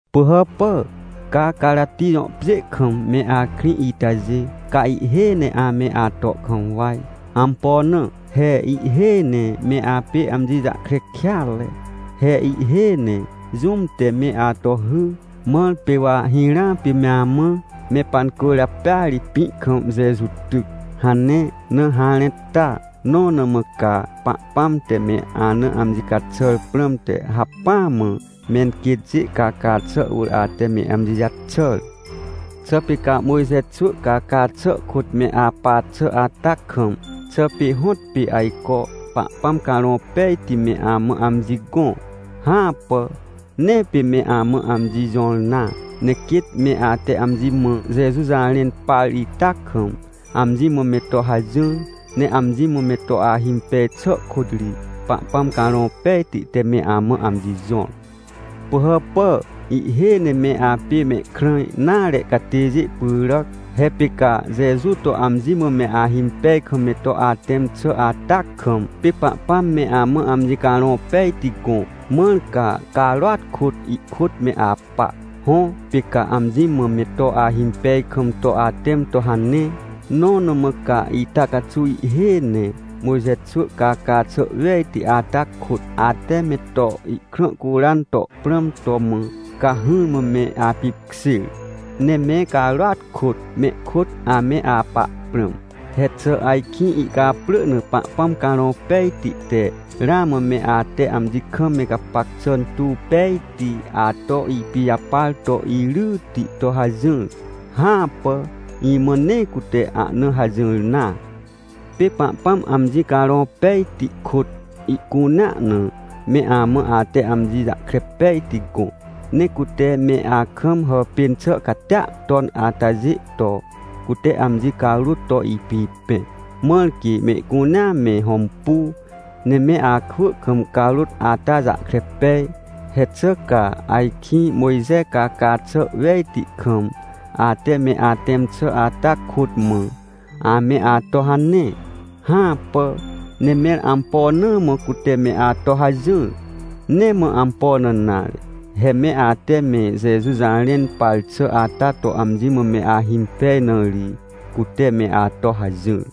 Pỳhàpà, ca Carati jõ pjê kam me akrĩ itajê, ca ihhêj ne ame ato kam waj. Ampo na? He ihhêj ne me apê amji jahkre kêatre. He ihhêj ne jũm te me ato hy. Mãr pê wa hirãa pê me amã: — Me pancwỳrjapêa ri pĩ kam Jeju tyc — hane na harẽ ta? Nõ na mã ca, Pahpãm te me ana amji caxàr prãmte hacpỹa mã menquêtjê caca xà wỳr ate me amji jaxàr? Xà pê ca Mojxe xwỳ caca xà kôt me apa xà ata kam, xà pê hõtpê ajco Pahpãm Carõ Pejti me amã amji gõ? Hãpà, nee pê me amã amji jõr nare. Ne quêt me ate amji mã, Jeju jarẽn par ita kam, amji mã me to hajỹr, ne amji mã me to ahimpej xà kôt ri, Pahpãm Carõ Pejti te me amã amji jõr. Pỳhàpà, ihhêj ne me apê mehkrã nare catêjê pyràc. He pê ca Jeju to amji mã me ahimpej kam me to atẽm xà ata kam, pê Pahpãm me amã amji Carõ Pejti gõ, mãr ca, carôat kôt, ihkôt me apa. Hõ, pê ca amji mã me to ahimpej kam to atẽm to hane. Nõ na mã ca ita caxuw ihhêj ne Mojxe xwỳ caca xà wejti ata kôt, ate me to ihkrã curan to prãm to mã, ca hỹrmã me apipkjêr? Ne me carôat kôt mehkôt ame apa prãm. He xà ajkĩ ihcaprỳ na Pahpãm Carõ Pejti te ramã me ate amji kam me gapac xà tuw pejti ato ipijapar to iryti to hajỹr? Hãpà, imã nee cute ahna hajỹr nare! Pê Pahpãm amji Carõ Pejti kôt, ihcunea na, me amã ate amji jahkre pejti gõ. Ne cute me akam hàpên xà catia ton atajê to, cute amji carôt to ipipẽ, mãr quê mehcunea me hõmpu, ne me akwỳ kam carôt ata jahkre pej. He xà ca ajkĩ, Mojxe caca xà wejti kam, ate me atẽm xà ata kôt mã, ame ato hane? Hãpà! Ne mẽr ampo na mã cute me ato hajỹr? Nee mã ampo na nare, he me ate me Jeju jarẽn par xà ata to amji mã me ahimpej na ri, cute me ato hajỹr.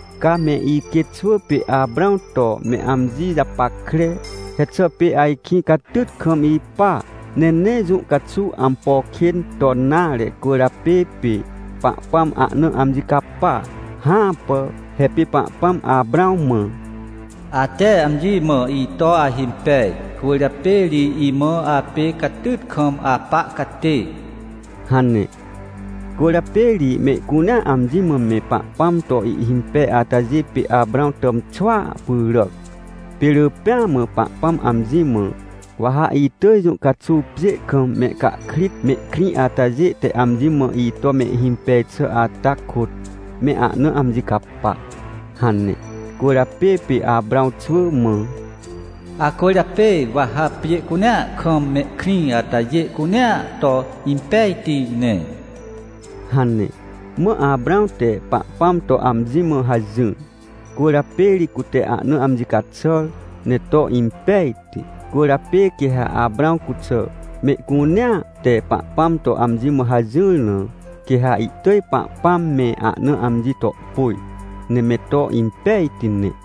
Ca me iquêtxwỳ pê Aprãw to me amji japackre! He xà pê ajkĩ catyt kam ipa, ne nee jũ caxuw ampo kên ton nare cwỳrjapê pê Pahpãm ahna amji capa? Hãpà. He pê Pahpãm Aprãw mã: — Ate amji mã ito ahimpej, cwỳrjapê ri imã apê catyt kam apa catê — hane. Cwỳrjapê ri mehcunea amji mã me Pahpãm to ihhimpej atajê pê Aprãw tàmxwỳa pyràc. Pê rỳ pêa mã Pahpãm amji mã: — Wa ha itỳj jũ caxuw pjê kam mehcahkrit mehkrĩ atajê te amji mã ito mehhimpej xà ata kôt, me ahna amji capa — hane. Cwỳrjapê pê Aprãw xwỳ mã: — Acwỳrjapê wa ha pjê cunea kam mehkrĩ atajê cunea to impejti ne — hane. Mã Aprãw te Pahpãm to amji mã hajỹr, cwỳrjapê ri cute ahna amji caxàr ne to impejti. Cwỳrjapê quê ha Aprãw cuxà mehcunea te Pahpãm to amji mã hajỹr na, quê ha ihtỳj Pahpãm me ahna amji to pôj, ne me to impejti ne.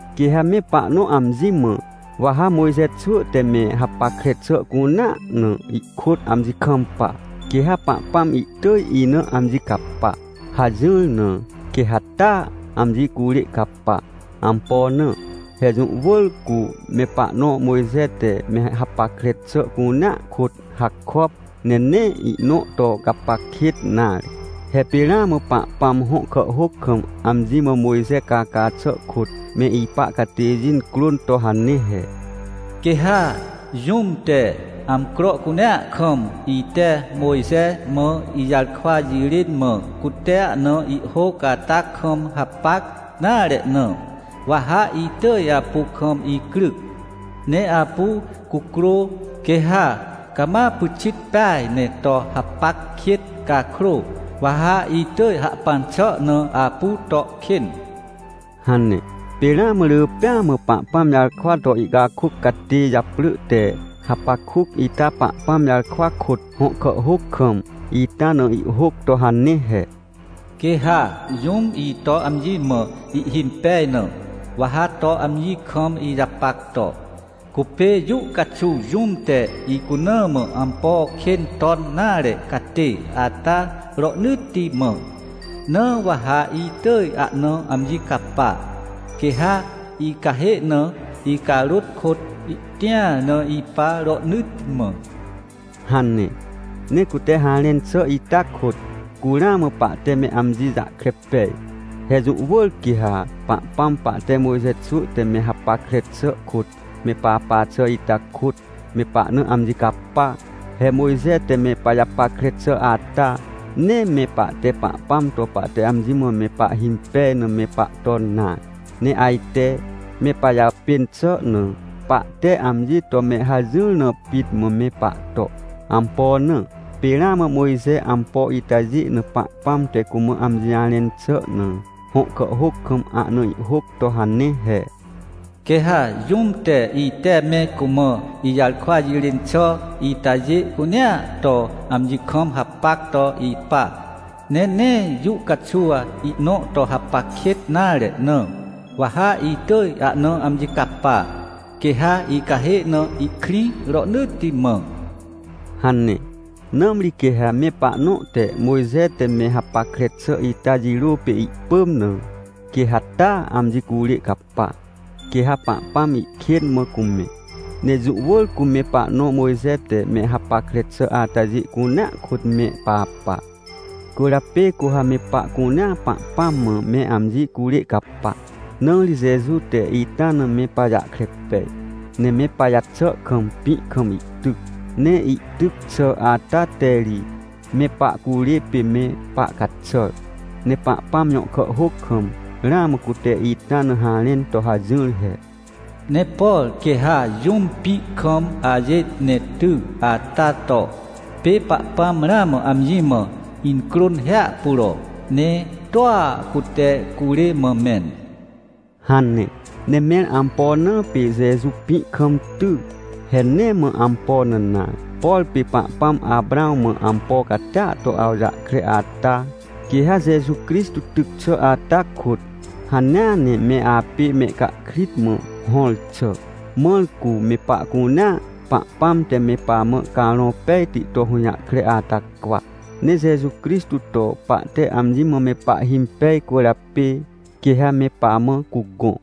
Quê ha me pahnõ amji mã: — Wa ha Mojxe xwỳ te me hapackre xà cunea na ihkôt amji kampa, quê ha Pahpãm ihtỳj ina amji capa — hajỹr na, quê ha taa, amji curê capa. Ampo na? He jũ wỳr cu me pahnõ Mojxe te me hapackre xà cunea kôt hakop, ne nee ihnõ to gapac kêt nare. He pê ramã Pahpãm hõ kàhhôc kam amji mã Mojxe caca xà kôt me ipa catêjê crôn to hane he: “Quê ha jũm te, amcro cunea kam ite Mojxe mã ijarkwa jirên mã cute ahna ihhôc ata kam hapac nare na, wa ha itỳj apu kam icryc, ne apu cucrô. Quê ha cama pyxit peaj ne to hapac kêt cakrô, wa ha itỳj hahpan xà na apu to kên” hane. Pê ramã rỳ pêa mã Pahpãm jarkwa to ihcakôc catê japrỳ te Hapakuc ita Pahpãm jarkwa kôt hõ kàhhôc kam, ita na ihhôc to hane he: “Quê ha jũm ito amji mã ihhimpej na, wa ha to amji kam ijapac to, cupê jũ caxuw jũm te icuna mã ampo kên ton nare catê ata rohnỳtti mã. Na wa ha itỳj ahna amji capa, quê ha icahê na icarôt kôt ihtĩar na ipa rohnỳtti mã” hane. Ne cute harẽn xà ita kôt, cu ramã pahte me amji jahkre pej. He jũ wỳr quê ha Pahpãm pahte Mojxe xwỳ te me hapackre xà kôt me papa xà ita kôt, me pahna amji capa. He Mojxe te me pajapackre xà ata, nee me pahte Pahpãm to pahte amji mã me pahhimpej na me pahton nare, ne ajte me pajàpên xà na, pahte amji to me hajỹr na pit mã me pahto. Ampo na? Pê ramã Mojxe ampo itajê na Pahpãm te cumã amji jarẽn xà na, hõ kàhhôc kam ahna ihhôc to hane he: “Quê ha jũm te ite me cumã ijarkwa jirên xà itajê cunea to amji kam hapac to ipa, ne nee jũ caxuw ihnõ to hapac kêt nare na, wa ha itỳj ahna amji capa, quê ha icahê na ihkrĩ rohnỳtti mã” hane. Nãmri quê ha me pahnõ te Mojxe te me hapackre xà ita jirô pê ihpỳm na, quê ha taa amji curê capa, quê ha Pahpãm ihkên mã cumẽ. Ne jũ wỳr cu me pahnõ Mojxe te me hapackre xà atajê cunea kôt me papa. Cwỳrjapê cu ha me pahcunea Pahpãm mã me amji curê capa. Na ri Jeju te ita na me pajahkre pej, ne me pajaxà kam pĩ kam ihtyc. Ne ihtyc xà ata te ri me pahcurê pê me pahcaxàr. Ne Pahpãm jõ kàhhôc kam, ramã cute ita na harẽn to hajỹr he: “Ne por quê ha jũm pĩ kam ajêt ne ty, ata to, pê Pahpãm ramã amji mã incrôn hiahpuro, ne toa cute curê mã mẽn” hane. Ne mẽr ampo na pê Jeju pĩ kam ty? He nee mã ampo na nare, por pê Pahpãm Aprãw mã ampo catia to awjahkre ata, quê ha Jeju Crixtô tyc xà ata kôt, hanea ne me apê mehcahkrit mã hõr xà. Mãr cu, me pahcunea, Pahpãm te me pamã Carõ Pejti to hũjahkre ata cwa. Ne Jeju Crixtô to pahte amji mã me pahhimpej cwỳrjapê, quê ha me pamã cugõ.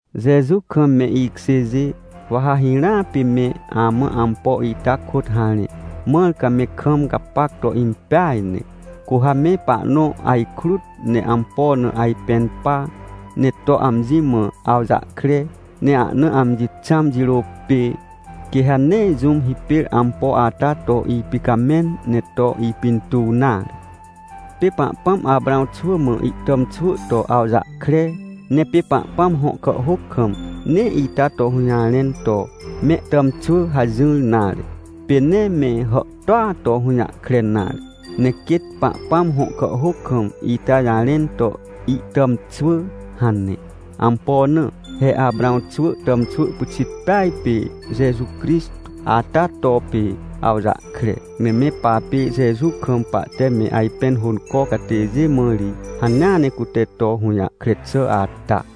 Jeju kam me ikjêjê, wa ha hirãa pê me amã ampo ita kôt harẽ, mãr ca me kam gapac to impeaj ne. Cu ha me pahnõ ajkrut ne ampo na ajpẽn pa, ne to amji mã awjahkre, ne ahna amji xãm jirô pê, quê ha nee jũm hipêr ampo ata to ipicamẽn ne to ipintuw nare. Pê Pahpãm Aprãw xwỳ mã ihtàmxwỳ to awjahkre. Ne pê Pahpãm hõ kàhhôc kam, nee ita to hũjarẽn to: “Mehtàmxwỳ” hajỹr nare, pê nee me hàhtôa to hũjahkre nare, ne quêt Pahpãm hõ kàhhôc kam ita jarẽn to: “Ihtàmxwỳ” hane. Ampo na? He Aprãw xwỳ tàmxwỳ pyxit peaj pê Jeju Crixtô ata to, pê awjahkre. Ne me papê Jeju kam pahte me ajpẽn hônco catêjê mã ri, hanea ne cute to hũjahkre xà ata.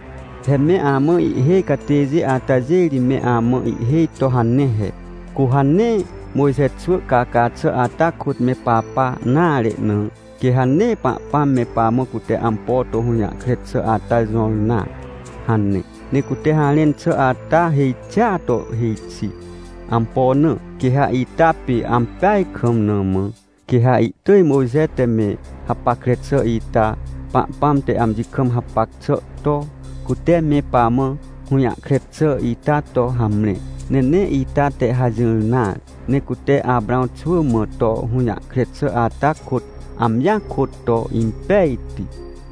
He me amã ihhêj catêjê atajê ri me amã ihhêj to hane he: — Cu ha nee Mojxe xwỳ caca xà ata kôt me papa nare na, quê ha nee Pahpãm me pamã cute ampo to hũjahkre xà ata jõr nare — hane. Ne cute harẽn xà ata hêj xia to hêj xi. Ampo na? Quê ha ita pê ampeaj kam mã, quê ha ihtỳj Mojxe te me hapackre xà ita, Pahpãm te amji kam hapac xà to, cute me pamã hũjahkre xà ita to hamre. Ne nee ita te hajỹr nare, ne cute Aprãw xwỳ mã to hũjahkre xà ata kôt, amjia kôt to impejti.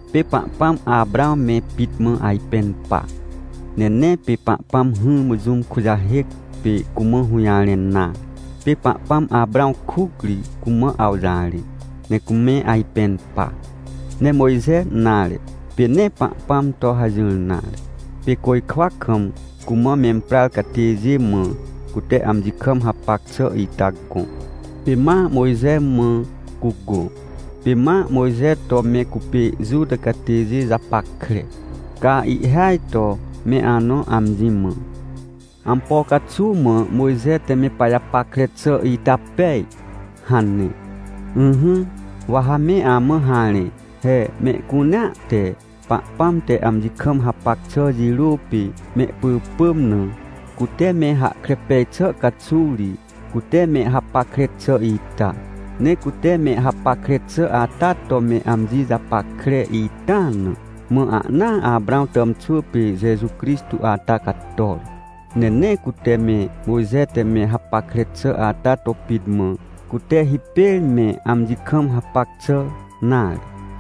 Pê Pahpãm Aprãw me pit mã ajpẽn pa. Ne nee pê Pahpãm hỹrmã jũm kujahêc, pê cumã hũjarẽn nare. Pê Pahpãm Aprãw kuc ri cumã awjarẽ, ne cume ajpẽn pa. Ne Mojxe nare, pê nee Pahpãm to hajỹr nare. Pê côjkwa kam cumã memprar catêjê mã, cute amji kam hapac xà ita gõ, pê ma Mojxe mã cugõ, pê ma Mojxe to me cupê Juta catêjê japackre. Ca ihhêaj to me anõ amji mã: — Ampo caxuw mã Mojxe te me pajapackre xà ita pej? — hane. Ỹhỹ, wa ha me amã harẽ. He mehcunea te Pahpãm te amji kam hapac xà jirô pê mehpỳpỳm na, cute me hahkre pej xà caxuw ri, cute me hapackre xà ita. Ne cute me hapackre xà ata to me amji japackre ita na, mã ahnaa Aprãw tàmxwỳ pê Jeju Crixtô ata cator. Ne nee cute me Mojxe te me hapackre xà ata to pit mã, cute hipêr me amji kam hapac xà nare.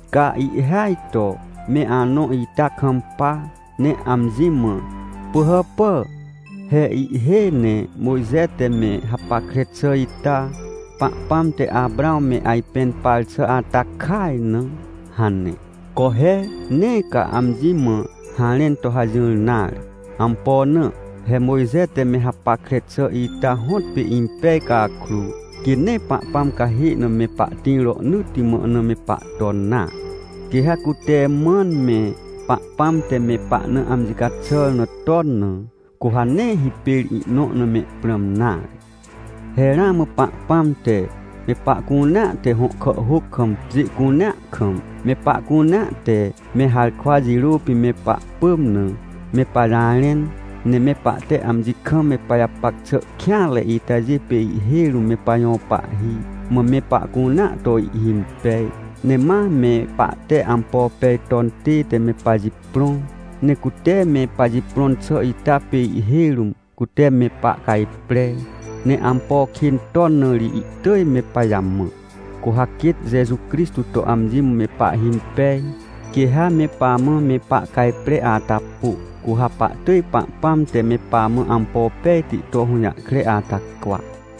Ca ihhêaj to me anõ ita kampa, ne amji mã: — Pỳhàpà, he ihhêj ne Mojxe te me hapackre xà ita, Pahpãm te Aprãw me ajpẽn par xà ata kaj na — hane. Co he! Nee ca amji mã harẽn to hajỹr nare. Ampo na? He Mojxe te me hapackre xà ita hõtpê impej cakrô, quê nee Pahpãm cahê na me pahtĩr rohnỳtti mã na me pahton nare. Quê ha cute mãn me Pahpãm te me pahna amji caxàr na ton na, cu ha nee hipêr ihnõ na mehprãm nare. He ramã Pahpãm te, me pahcunea te hõ kàhhôc kam pjê cunea kam, me pahcunea te me harkwa jirô pê me pahpỳm na, me pajarẽn. Ne me pahte amji kam me pajapac xà kêanre itajê pê ihhêj rũm me pajõ pahhi, mã me pahcunea to ihhimpej. Ne ma me pahte ampo pej ton tête me pajiprõ. Ne cute me pajiprõn xà ita pê ihhêj rũm cute me pahcajpre. Ne ampo kên ton na ri ihtỳj me pajamã. Cu ha quêt Jeju Crixtô to amji mã me pahhimpej, quê ha me pamã me pahcajpre ata pô, cu ha pahtỳj Pahpãm te me pamã ampo pejti to hũjahkre ata cwa.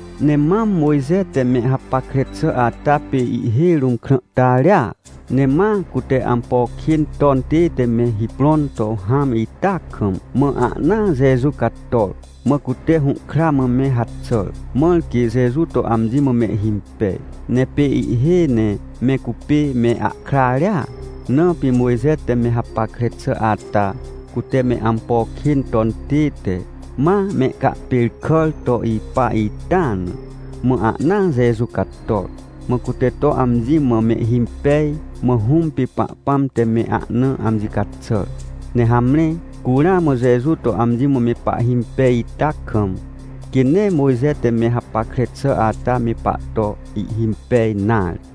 Ne mam Mojxe te me hapackre xà ata pê ihhêj rũm krãhtarea, ne ma cute ampo kên ton tête me hiprõn to hãm ita kam, mã ahnaa Jeju cator, mã cute hũhkra mã me haxàr, mãr quê Jeju to amji mã mehhimpej. Ne pê ihhêj ne me cupê me ahkrarea, na pê Mojxe te me hapackre xà ata, cute me ampo kên ton tête, ma mehcahpêrkàr to ipa ita na, mã ahnaa Jeju cator. Mã cute to amji mã mehhimpej, mã Hũm pê Pahpãm te me ahna amji caxàr. Ne hamre, cu ramã Jeju to amji mã me pahhimpej ita kam, quê nee Mojxe te me hapackre xà ata me pahto ihhimpej nare.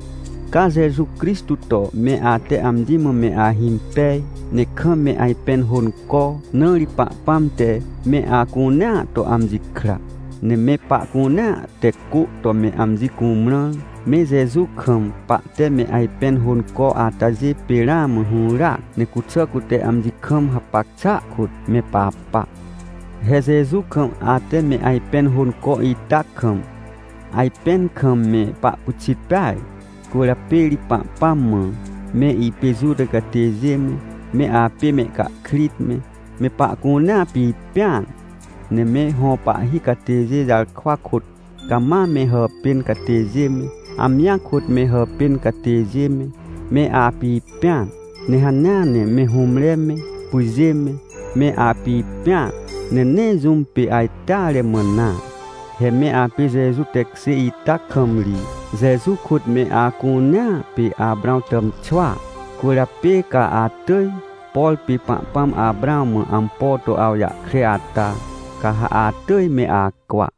Ca Jeju Crixtô to me ate amji mã me ahimpej, ne kam me ajpẽn hônco, na ri Pahpãm te me acunea to amji kra. Ne me pahcunea te cô to me amji cumrãr, me Jeju kam pahte me ajpẽn hônco atajê pê ramã hũràac, ne cuxà cute amji kam hapac xàa kôt me papa. He Jeju kam ate me ajpẽn hônco ita kam, ajpẽn kam me pahpyxit peaj. Cwỳrjapê ri Pahpãm mã, me ipê Juta catêjê me, me apê mehcahkrit me, me pahcunea pipẽan. Ne me hõ pahhi catêjê jarkwa kôt cama me hàpên catêjê me, amjia kôt me hàpên catêjê me, me apipẽan. Ne hanea ne me hũmre me, pyjê me, me apipẽan, ne nee jũm pê ajteare mã nare. He me apê Jeju tekjê ita kam ri, Jeju kôt me acunea pê Aprãw tàmxwỳa. Cwỳrjapê ca atỳj, por pê Pahpãm Aprãw mã ampo to awjahkre ata, ca ha atỳj me acwa.